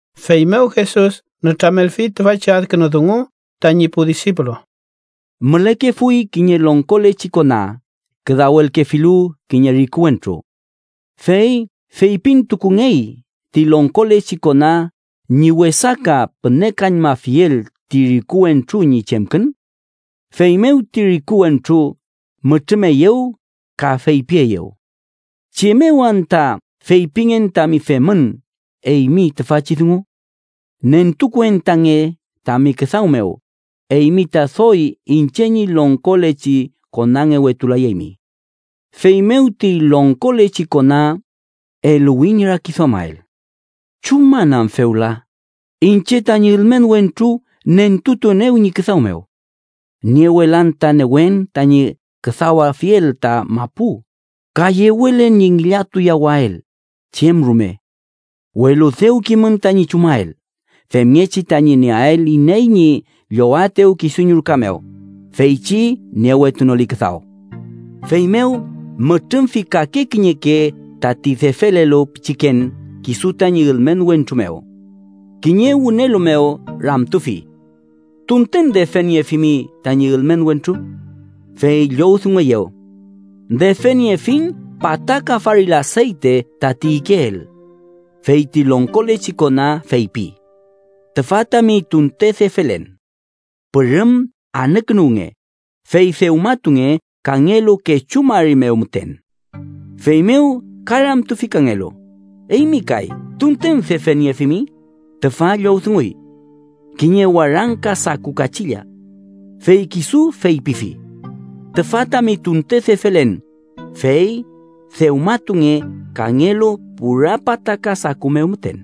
Feymew Jesus nütramelfi tüfachi adkünu dungu tañi pu disipulu: “Mülekefuy kiñe longkolechi kona küdawelkefilu kiñe riku wentru. Fey feypintukungey ti longkolechi kona ñi wesaka pünekañmafiel ti riku wentru ñi chemkün. Feymew ti riku wentru mütrümeyew ka feypieyew: ‘¿Chem mew anta feypingen tami femün eymi tüfachi dungu? Nentukuentange tami küdaw mew, eymi ta doy iñche ñi longkolechi konangewetulayaymi.’ “Feymew ti longkolechi kona eluwi ñi rakiduamael: ‘¿Chuman am fewla iñche tañi ülmen wentru nentutuenew ñi küdaw mew? Niewelan ta newen tañi küdawafiel ta mapu, ka yewelen ñi ngillatuyawael chem rume. Welu dew kimün tañi chumael, femngechi tañi nieael iney ñi llowaetew kisu ñi ruka mew, feychi niewetunoli küdaw.’ “Feymew mütrümfi kake kiñeke tati defelelu pichiken kisu tañi ülmen wentru mew. Kiñe wünelu mew ramtufi: ‘¿Tunten defeniefimi tañi ülmen wentru?’ Fey llowdungueyew: ‘¡Defeniefiñ pataka faril aseyte tati ikeel!’ Fey ti longkolechi kona feypi: ‘Tüfa tami tunte defelen. Pürüm anükünuwnge, fey dewmatunge kangelu kechu mari mew müten.’ Feymew ka ramtufi kangelu: ‘Eymi kay, ¿tunten defeniefimi?’ Tüfa llowdunguy: ‘Kiñe warangka saku kachilla.’ Fey kisu feypifi: ‘Tüfa tami tunte defelen, fey dewmatunge kangelu pura pataka saku mew müten.’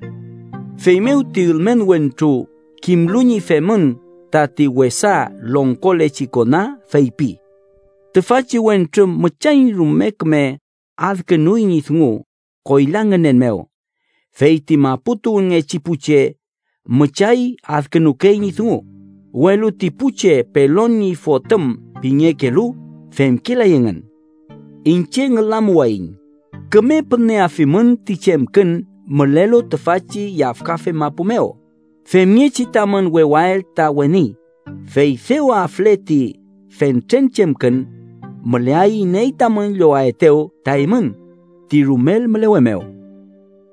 “Feymew ti ülmen wentru kimlu ñi femün tati wesa longkolechi kona feypi: ‘Tüfachi wentru müchay rume küme adkünuy ñi dungu koyla ngünen mew. Fey ti mapu tuwünngechi pu che müchay adkünukey ñi dungu, welu ti pu che pelon ñi fotüm pingekelu femkelay engün.’ Iñche ngülamuwayiñ, küme püneafimün ti chemkün mülelu tüfachi yafkafe mapu mew femngechi tamün wewael ta weni, fey dew afle ti fentren chemkün, müleay iney tamün llowaetew ta eymün ti rumel mülewe mew.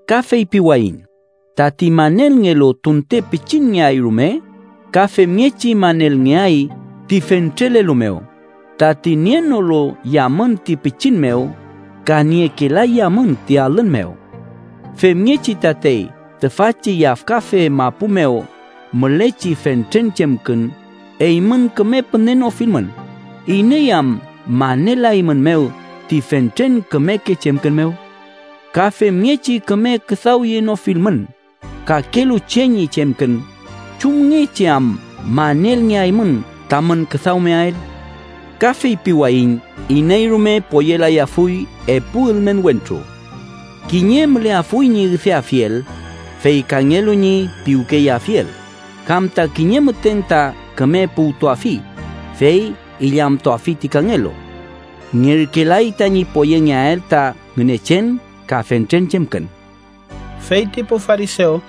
“Ka feypiwayiñ, tati manelngelu tunte pichinngeay rume, ka femngechi manelngeay ti fentrelelu mew, tati nienolu yamün ti pichin mew ka niekelay yamün ti alün mew. Femngechi tatey tüfachi yafkafe mapu mew mülechi fentren chemkün eymün küme pünenofilmün, ¿iney am manelaeymünmew ti fentren kümeke chemkün mew? Ka femngechi küme küdawyenofilmün kakelu che ñi chemkün, ¿chumngechi am manelngeaymün tamün küdawmeael? “Ka feypiwayiñ iney rume poyelayafuy epu ülmen wentru. Kiñe müleafuy ñi üdeafiel, fey kangelu ñi piwkeyeafiel, kam ta kiñe müten ta küme puwtuafi, fey illamtuafi ti kangelu. Ngerkelay tañi poyengeael ta Ngünechen ka fentren chemkün.” Fey ti pu farisew,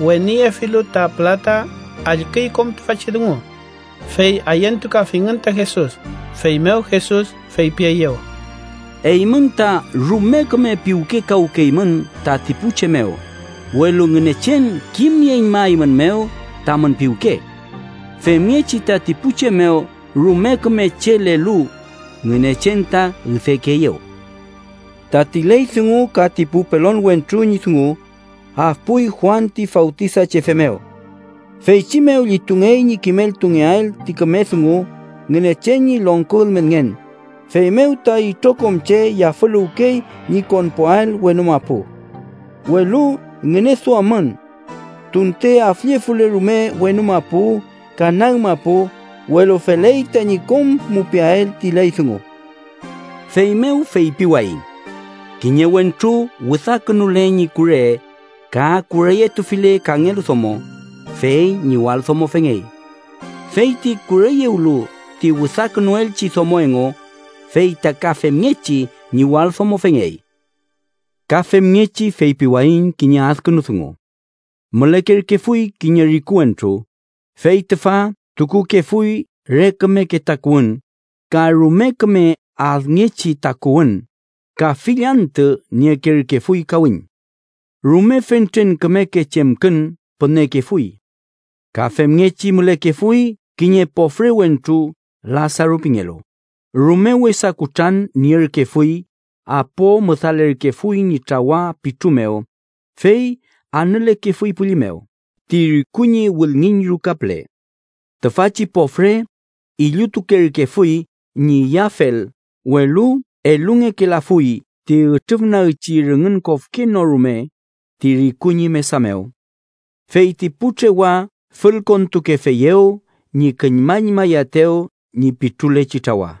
weniyefilu ta pülata allküy kom tüfachi dungu, fey ayentukafingün ta Jesus. Feymew Jesus feypieyew: “Eymün ta rume küme piwkekawünkeymün tati pu che mew, welu Ngünechen kimnieñmaeymünmew tamün piwke. Femngechi tati pu che mew rume küme chelelu, Ngünechen ta üdekeeyew. “Tati ley dungu ka ti pu pelon wentru ñi dungu afpuy Juan ti Fawtisachefe mew. Feychi mew llitungey ñi kimeltungeael ti küme dungu Ngünechen ñi longko ülmenngen, feymew ta itrokom che yafüluwkey ñi konpuael wenu mapu. “Welu ngüneduammün: tunte afllefule rume wenu mapu ka nag mapu, welu feley tañi kom mupiael ti ley dungu. “Feymew feypiwayiñ: kiñe wentru wüdakünule ñi kure ka kureyetufile kangelu domo, fey ñiwaldomofengey. Feyti kureyewlu ti wüdakünuelchi domo engu, fey ta ka femngechi ñiwaldomofengey. “Ka femngechi feypiwayiñ kiñe adkünu dungu: Mülekerkefuy kiñe riku wentru, fey tüfa tukukefuy re kümeke takuwün ka rume küme adngechi takuwün, ka fill antü niekerkefuy kawiñ. Rume fentren kümeke chemkün pünekefuy. Ka femngechi mülekefuy kiñe pofre wentru Lasaru pingelu, rume wesa kutran nierkefuy apo müdalerkefuy ñi trawa pitru mew, fey anülekefuy pülli mew ti riku ñi wülngiñ ruka püle. Tüfachi pofre illutukerkefuy ñi iyafel, welu elungekelafuy ti ütrüfnagchi rüngün kofke no rume ti riku ñi mesa mew. Fey ti pu trewa fülkontukefeyew ñi küllmañmayaetew ñi pitrulechi trawa.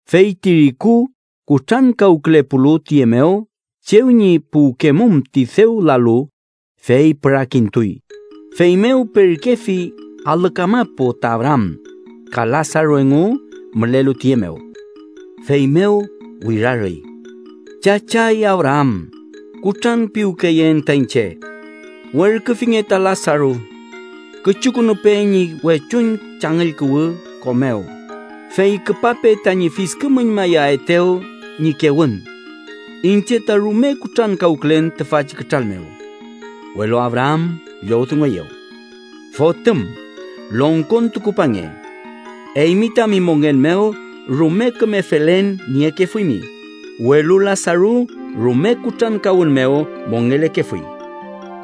“Fey ti riku kutrankawkülepulu tüye mew chew ñi puwkemum ti dew lalu, fey pürakintuy, feymew perkefi alü kamapu ta Abraam, ka Lasaru engu mülelu tüye mew. Feymew wirarüy: ‘¡Chachay Abraam, kutranpiwkeyeen ta iñche! Werküfinge ta Lasaru. Küchukünupe ñi wechuñ changüll kuwü ko mew, fey küpape tañi fiskümüñmayaetew ñi kewün. Iñche ta rume kutrankawkülen tüfachi kütral mew.’ Welu Abraam llowdungueyew: ‘Fotüm, longkontukupange. Eymi tami mongen mew rume küme felen niekefuymi, welu Lasaru rume kutrankawün mew mongelekefuy.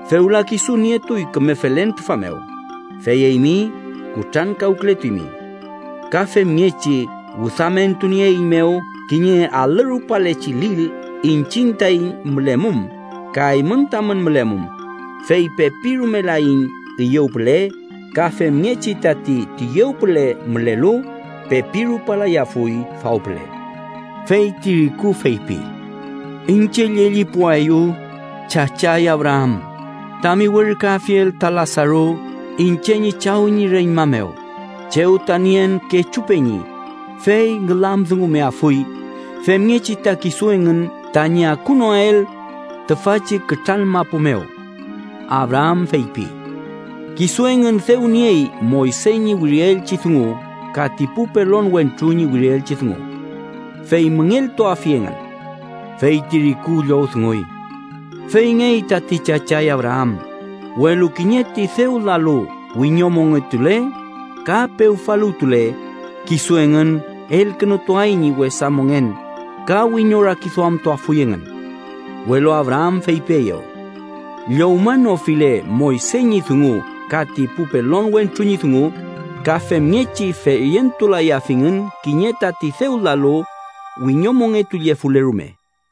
Fewla kisu nietuy küme felen tüfa mew, fey eymi kutrankawkületuymi. Ka femngechi wüdamentunieeiñmew kiñe alü rupalechi lil iñchiñ taiñ mülemum ka eymün tamün mülemum, fey pepi rumelaiñ üyew püle, ka femngechi tati tüyew püle mülelu, pepi rupalayafuy faw püle.’ “Fey ti riku feypi: ‘Iñche llellipuaeyu, chachay Abraam, tami werküafiel ta Lasaru iñche ñi chaw ñi reñma mew chew ta nien kechu peñi, fey ngülamdungumeafuy femngechi ta kisu engün tañi akunoael tüfachi kütral mapu mew.’ Abraam feypi: ‘Kisu engün dew niey Moyse ñi wirielchi dungu ka ti pu pelon wentru ñi wirielchi dungu: ¡Fey müngeltuafi engün!’ Fey ti riku llowdunguy: ‘Feyngey tati, chachay Abraam, welu kiñe ti dew lalu wiñomongetule ka pewfaluwtule, kisu engün elkünutuay ñi wesa mongen ka wiñorakiduamtuafuy engün.’ Welu Abraam feypieyew: ‘Llowmanofile Moyse ñi dungu ka ti pu pelon wentru ñi dungu, ka femngechi feyentulayafingün kiñe tati dew lalu, wiñomongetullefule rume.’”